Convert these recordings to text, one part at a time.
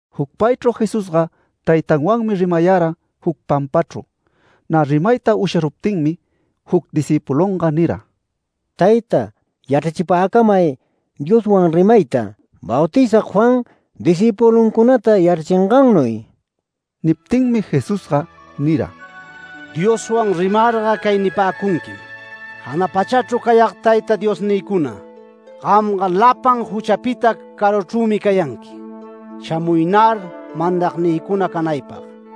Jucpaychru Jesusga Taytanwanmi rimayara juc pampachru. Nä rimayta usharuptinmi juc discïpulunga nira: “Tayta, yachrachipäcamay Dioswan rimayta, Bautizag Juan discïpuluncunata yachrachingannuy”. Niptinmi Jesusga nira: “Dioswan rimarga cay nipäcunquim: ‘Jana pachachru cayag Tayta Diosnïcuna, gamga lapan juchapita caruchrümi cayanqui, shamuynar mandagnïcuna canaypag.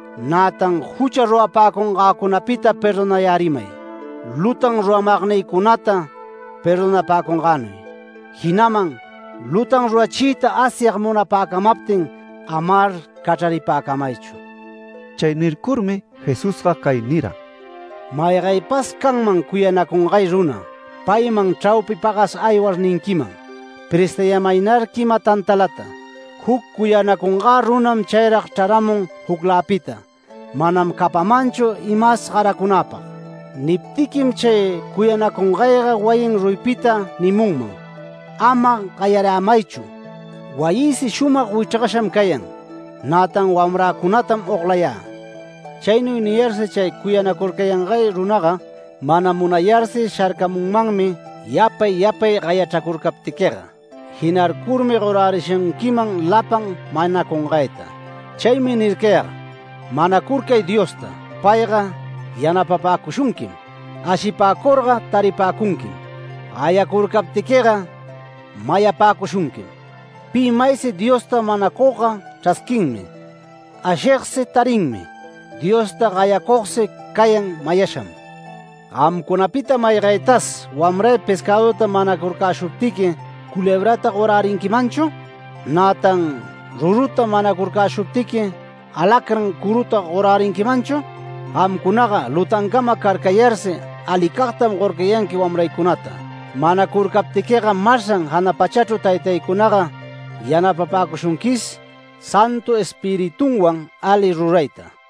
Nätan jucha rurapäcungäcunapita perdonayärimay, lutan ruramagnïcunata perdonapäcungänuy. Jinaman lutan rurachiyta Asyag munapäcamaptin amar cachraripäcuychu’”. Chay nircurmi Jesús cay nira: “Maygaypas canman cuyanacungay runa, payman chraupi pagas aywar ninquiman: ‘Prestayämaynar quima tantalata. Juc cuyanacungä runam chayrag chraramun jucläpita. Manam capanmanchu imas garacunäpag’. Niptiquim, chay cuyanacungayga wayin ruyipita nimunman: ‘Ama gayarämaychu. Wayïsi shumag wichrgasham cayan, nätan wamracunatam oglayä’. Chaynuy niyarsi chay cuyanacurcangay runaga, mana munayarsi sharcamunmanmi yapay yapay gayachracurcaptiquiga. Jinarcurmi gorärishunquiman lapan manacungayta. Chaymi nircayag: Manacurcay Diosta, payga yanapapäcushunquim. Ashipäcurga, taripäcunquim. Gayacurcaptiquiga, mayapäcushunquim. Pi maysi Diosta manacugga, chrasquinmi, ashigsi tarinmi. Diosta gayacugsi cayan mayasham. Gamcunapita maygaytas wamray pescäduta manacurcäshuptiqui, ¿culebrata gorärinquimanchu? Nätan ruruta manacurcäshuptiqui, ¿alacrán curuta gorärinquimanchu? Gamcunaga lutancama carcayarsi alicagtam gorcayanqui wamraycunata. Manacurcaptiquiga masran jana pachachru Taytaycunaga yanapapäcushunquis Santu Espiritunwan ali rurayta”.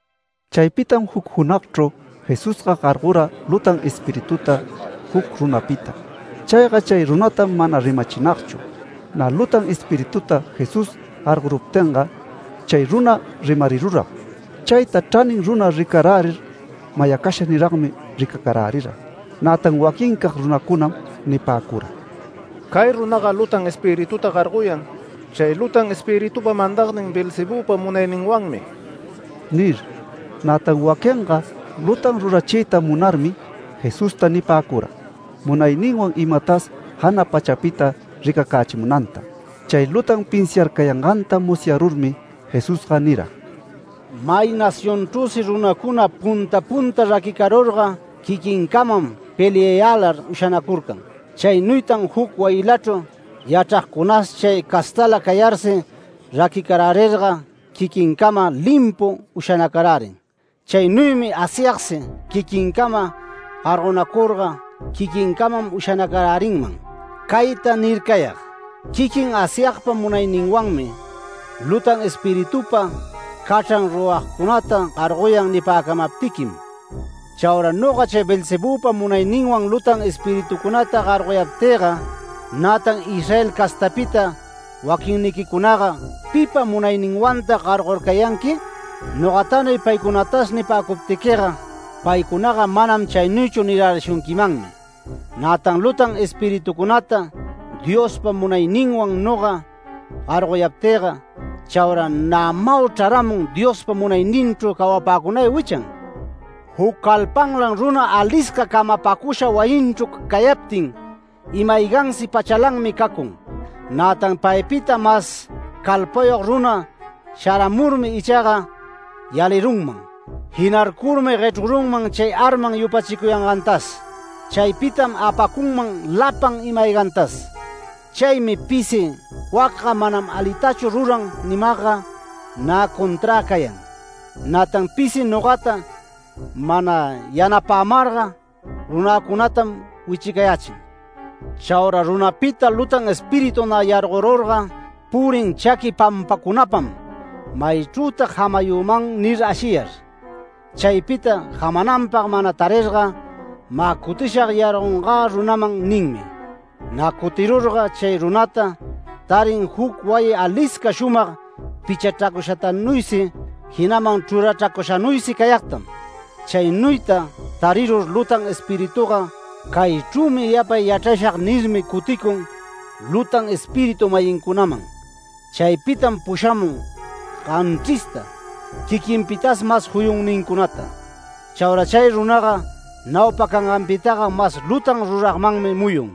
Chaypitam juc junagchru Jesusga gargora lutan espirituta juc runapita. Chayga chay runatam mana rimachinagchu. Nä lutan espirituta Jesús gargoruptinga chay runa rimariruram. Chayta chranin runa ricarärir mayacasha niragmi ricacarärira. Nätan waquincag runacunam nipäcura: “Cay runaga lutan espirituta gargoyan, chay lutan espiritupa mandagnin Beelzebüpa munayninwanmi” nir. Nätan waquinga lutan rurachiyta munarmi Jesusta nipäcura, munayninwan imatas jana pachapita ricacächimunanta. Chay lutan pinsiarcayanganta musyarurmi Jesusga nira: “May nacionchrüsi runacuna punta punta raquicarurga quiquincamam peliayälar ushanacurcan. Chaynuytan juc wayilachru yachragcunas chay castala cayarsi raquicarärirga quiquincamam limpu ushanacarärin. Chaynuymi Asyagsi quiquincama gargonacurga, quiquincamam ushanacarärinman. Cayta nircayag: ‘Quiquin Asyagpa munayninwanmi, lutan espiritupa cachran ruragcunata gargoyan’ nipäcamaptiquim. Chaura noga chay Beelzebüpa munayninwan lutan espiritucunata gargoyaptïga, nätan Israel castapita waquinniquicunaga, ¿pipa munayninwantag gargorcayanqui? Nogatanuy paycunatas nipäcuptiquiga, paycunataga ‘Manam chaynuychu’ nirärishunquimanmi. Nätan lutan espiritucunata Diospa munayninwan noga gargoyaptïga, chaura nämau chraramun Diospa munayninchru cawapäcunay wichan. Juc calpanlan runa alisca camapacusha wayinchru cayaptin, ima-aygansi pachalanmi cacun. Nätan paypita mas calpayog runa sharamurmi ichaga yalirunman. Jinarcurmi guechrurunman chay arman yupachicuyangantas. Chaypitam apacunman lapan ima-aygantas. Chaymi pisi wacga manam alitachu ruran nimagga, nä conträ cayan. Nätan pisi nogata mana yanapämarga runäcunatam wichicayächin”. “Chaura runapita lutan espíritu nä yargorurga, purin chaqui pampacunapam ‘Maychrütag jamayüman’ nir ashiyar. Chaypita jamananpag mana tarirga, ‘Mä cutishag yargocungä runaman’ ninmi. Nä cutirurga, chay runata tarin juc wayi alisca shumag pichachracushatanuysi, jinaman chrurachracushanuysi cayagtam. Chaynuyta tarirur lutan espirituga, ‘Caychrümi yapay yachrashag’ nirmi, cuticun lutan espiritu-mayincunaman. Chaypitam pushamun ganchrista, quiquinpitas mas juyunnincunata. Chaura chay runaga naupa canganpitaga mas lutan ruragmanmi muyun”.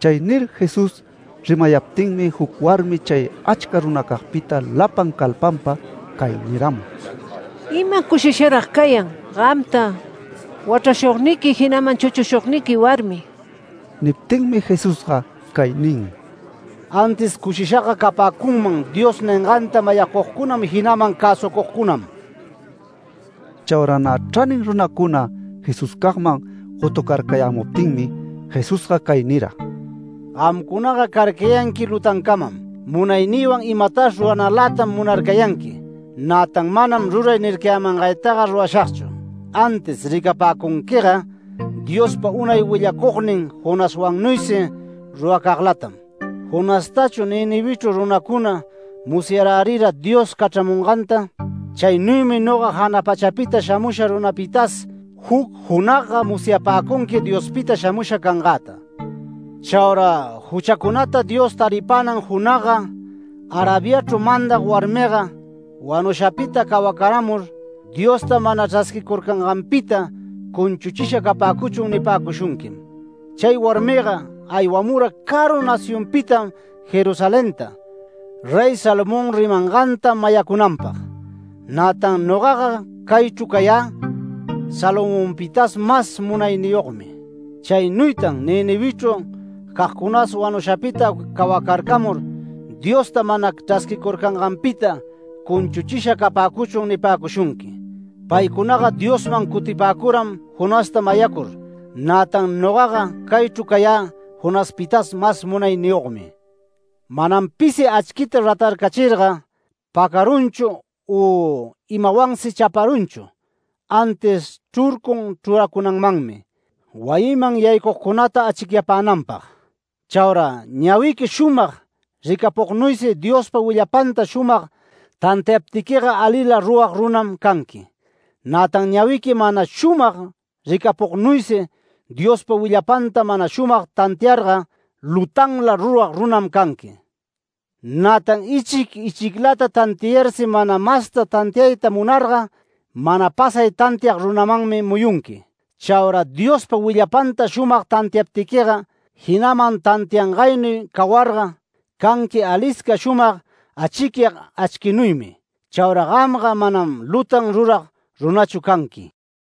Chay nir Jesús rimayaptinmi juc warmi chay achca runacagpita lapan calpanpa cay niramun: “¡Ima cushisharag cayan gamta wachrashugniqui, jinaman chuchushugniqui warmi!” Niptinmi Jesusga cay nin: “Antis cushishaga capäcunman Dios ninganta mayacugcunam, jinaman cäsucugcunam”. Chaura nä chranin runacuna Jesuscagman gotucarcayämuptinmi Jesusga cay nira: “Gamcunaga carcayanqui lutancamam, munaynïwan imatas ruranalätam munarcayanqui. Nätan manam ruray nircayämangaytaga rurashagchu. Antis ricapäcunquiga Diospa unay willacugnin Jonaswannuysi ruracaglatam. Jonastachu Ninivechru runacuna musyarärira Dios cachramunganta. Chaynuymi noga jana pachapita shamusha runapitas juc junagga musyapäcunqui Diospita shamusha cangäta. Chaura juchacunata Dios taripänan junagga Arabiachru mandag warmiga wanushapita cawacaramur: ‘Diosta mana chrasquicurcanganpita cunchuchisha capäcuchun’ nipäcushunquim. Chay warmiga aywamura caru nacionpitam Jerusalenta, Rey Salomón rimanganta mayacunanpag. Nätan nogaga caychru cayä Salomonpitas mas munayniyogmi. Chaynuytan Ninivechru cagcunas wanushapita cawacarcamur ‘Diosta mana chrasquicurcanganpita cunchuchisha capäcuchun’ nipäcushunqui. Paycunaga Diosman cutipäcuram Jonasta mayacur, nätan nogaga caychru cayä Jonaspitas mas munayniyogmi”. “Manam pisi achquita ratarcachirga, pacarunchu u imawansi chaparunchu. Antis chrurcun chruracunanmanmi, wayiman yaycugcunata achicyapänanpag. Chaura ñawiqui shumag ricapugnuysi Diospa willapanta shumag tantiaptiquiga alila rurag runam canqui. Nätan ñawiqui mana shumag ricapugnuysi Diospa willapanta mana shumag tantiarga lutanla rurag runam canqui. Nätan ichic ichiclata tantiayarsi mana masta tantiayta munarga, mana pasay tantiag runamanmi muyunqui. Chaura Diospa willapanta shumag tantiaptiquiga, jinaman tantiangaynuy cawarga, canqui alisca shumag achicyag achquinuymi. Chaura gamga manam lutan rurag runachu canqui”.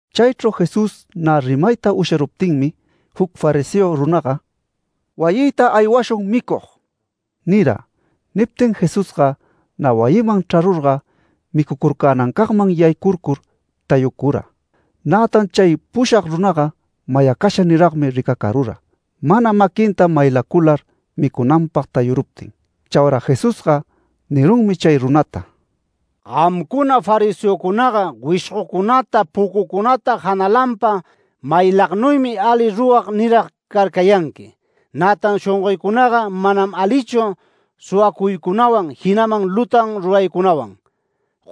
Chaychru Jesús nä rimayta usharuptinmi, juc fariseo runaga “Wayïta aywashun micug” nira. Niptin Jesusga nä wayiman chrarurga micucurcänancagman yaycurcur tayucura. Nätan chay pushag runaga mayacasha niragmi ricacarura, mana maquinta maylacular micunanpag tayuruptin. Chaura Jesusga nirunmi chay runata: “Gamcuna fariseocunaga, wishgocunata pucucunata janalanpa maylagnuymi ali rurag nirag carcayanqui, nätan shongoycunaga manam alichu suwacuycunawan, jinaman lutan ruraycunawan.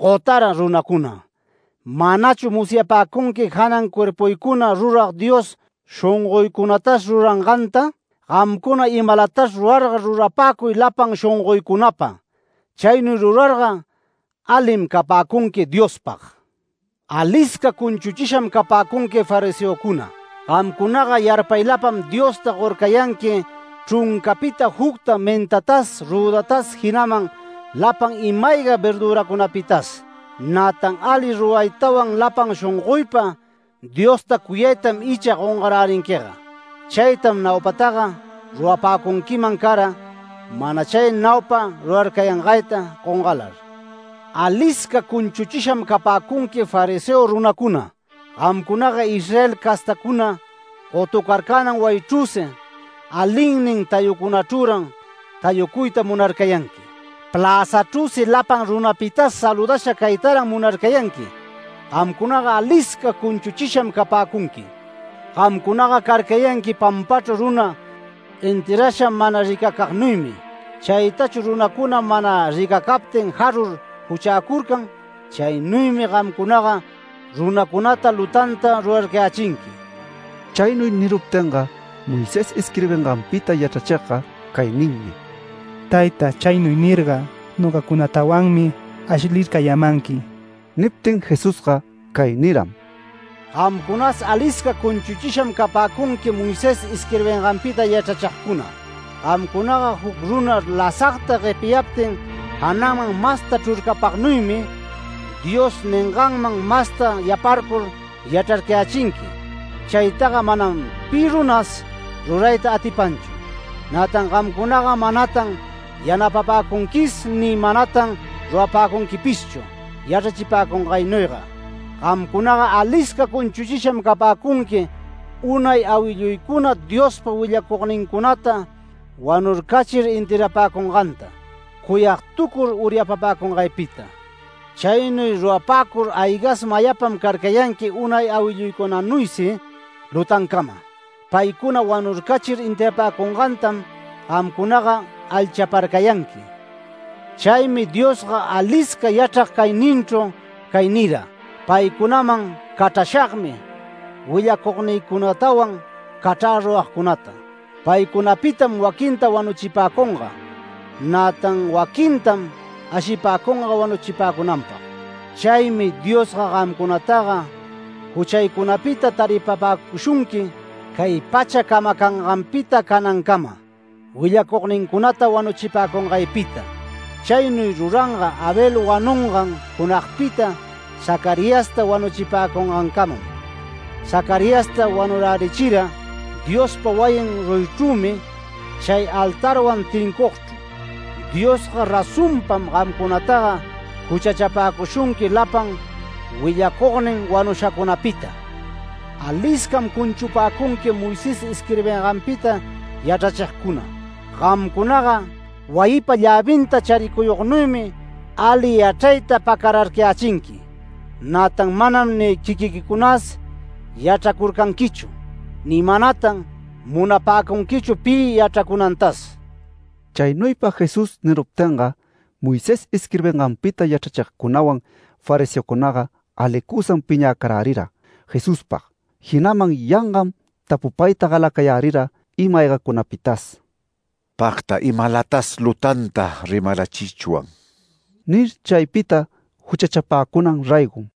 ¡Gotara runacuna! ¿Manachu musyapäcunqui janan cuerpuycuna rurag Dios shongoycunatas ruranganta? Gamcuna imalatas rurarga rurapäcuy lapan shongoycunapa. Chaynuy rurarga, alim capäcunqui Diospag. Alisca cunchuchisham capäcunqui, fariseocuna. Gamcunaga yarpaylapam Diosta gorcayanqui chruncapita jucta, mentatas rüdatas, jinaman lapan ima-ayga verdüracunapitas. Nätan ali ruraytawan, lapan shongoypa Diosta cuyaytam icha gongarärinquiga. Chaytam naupataga rurapäcunquiman cara, mana chay naupa rurarcayangayta gongalar. Alisca cunchuchisham capäcunqui fariseo runacuna. Gamcunaga Israel castacuna gotucarcänan wayichrüsi, alinnin tayucunachrüran tayucuyta munarcayanqui. Pläzachrüsi lapan runapitas saludasha caytaran munarcayanqui. Gamcunaga alisca cunchuchisham capäcunqui. Gamcunaga carcayanqui pampachru runa enterrasha mana ricacagnuymi. Chaytachu runacuna mana ricacaptin jarur juchäcurcan. Chaynuymi gamcunaga runacunata lutanta rurarcayächinqui”. Chaynuy niruptinga, Moisés isquirbinganpita yachrachigga cay ninmi: “Tayta, chaynuy nirga nogacunatawanmi ashlircayämanqui”. Niptin Jesusga cay niram: “Gamcunas alisca cunchuchisham capäcunqui Moisés isquirbinganpita yachrachigcuna. Gamcunaga juc runa lasagta guepiyaptin, jananman masta chrurcapagnuymi, Dios ninganman masta yaparcur yachrarcayächinqui. Chaytaga manam pi runas rurayta atipanchu. Nätan gamcunaga manatan yanapapäcunquis ni manatan rurapäcunquipishchu yachrachipäcungaynuyga. Gamcunaga alisca cunchuchisham capäcunqui. Unay awilluycuna Diospa willacugnincunata wanurcachir enterrapäcunganta, cuyagtucur uryapapäcungaypita. Chaynuy rurapäcur aygas mayapam carcayanqui unay awilluycunanuysi lutancama. Paycuna wanurcachir enterrapäcungantam gamcunaga alchaparcayanqui”. Chaymi Diosga alisca yachrag cayninchru cay nira: “Paycunaman cachrashagmi willacugnïcunatawan cachrä ruragcunata. Paycunapitam waquinta wanuchipäcunga. Nätan waquintam ashipäcunga wanuchipäcunanpag. Chaymi Diosga gamcunataga juchaycunapita taripapäcushunqui cay pachata camacanganpita canancama, willacugnincunata wanuchipäcungaypita. Chaynuy ruranga Abel wanungan junagpita Zacariasta wanuchipäcungancamam. Zacariasta wanurärichira Diospa wayin ruyichrümi chay altarwan tincucugchru. Diosga razonpam gamcunataga juchachapäcushunqui lapan willacugnin wanushacunapita. Aliscam cunchupäcunqui Moisés isquirbinganpita yachrachigcuna. Gamcunaga wayipa llävinta charicuyugnuymi ali yachrayta pacararcayächinqui. Nätan manam ni quiquiquicunas yachracurcanquichu, ni manatan munapäcunquichu pi yachracunantas”. Chaynuypa Jesús niruptinga, Moisés isquirbinganpita yachrachigcunawan fariseocunaga alicusam piñäcarärira Jesuspag. Jinaman yangam tapupayta galacayärira ima-aygacunapitas. “Pagta imalatas lutanta rimarachichwan” nir, chaypita juchachapäcunan raygo.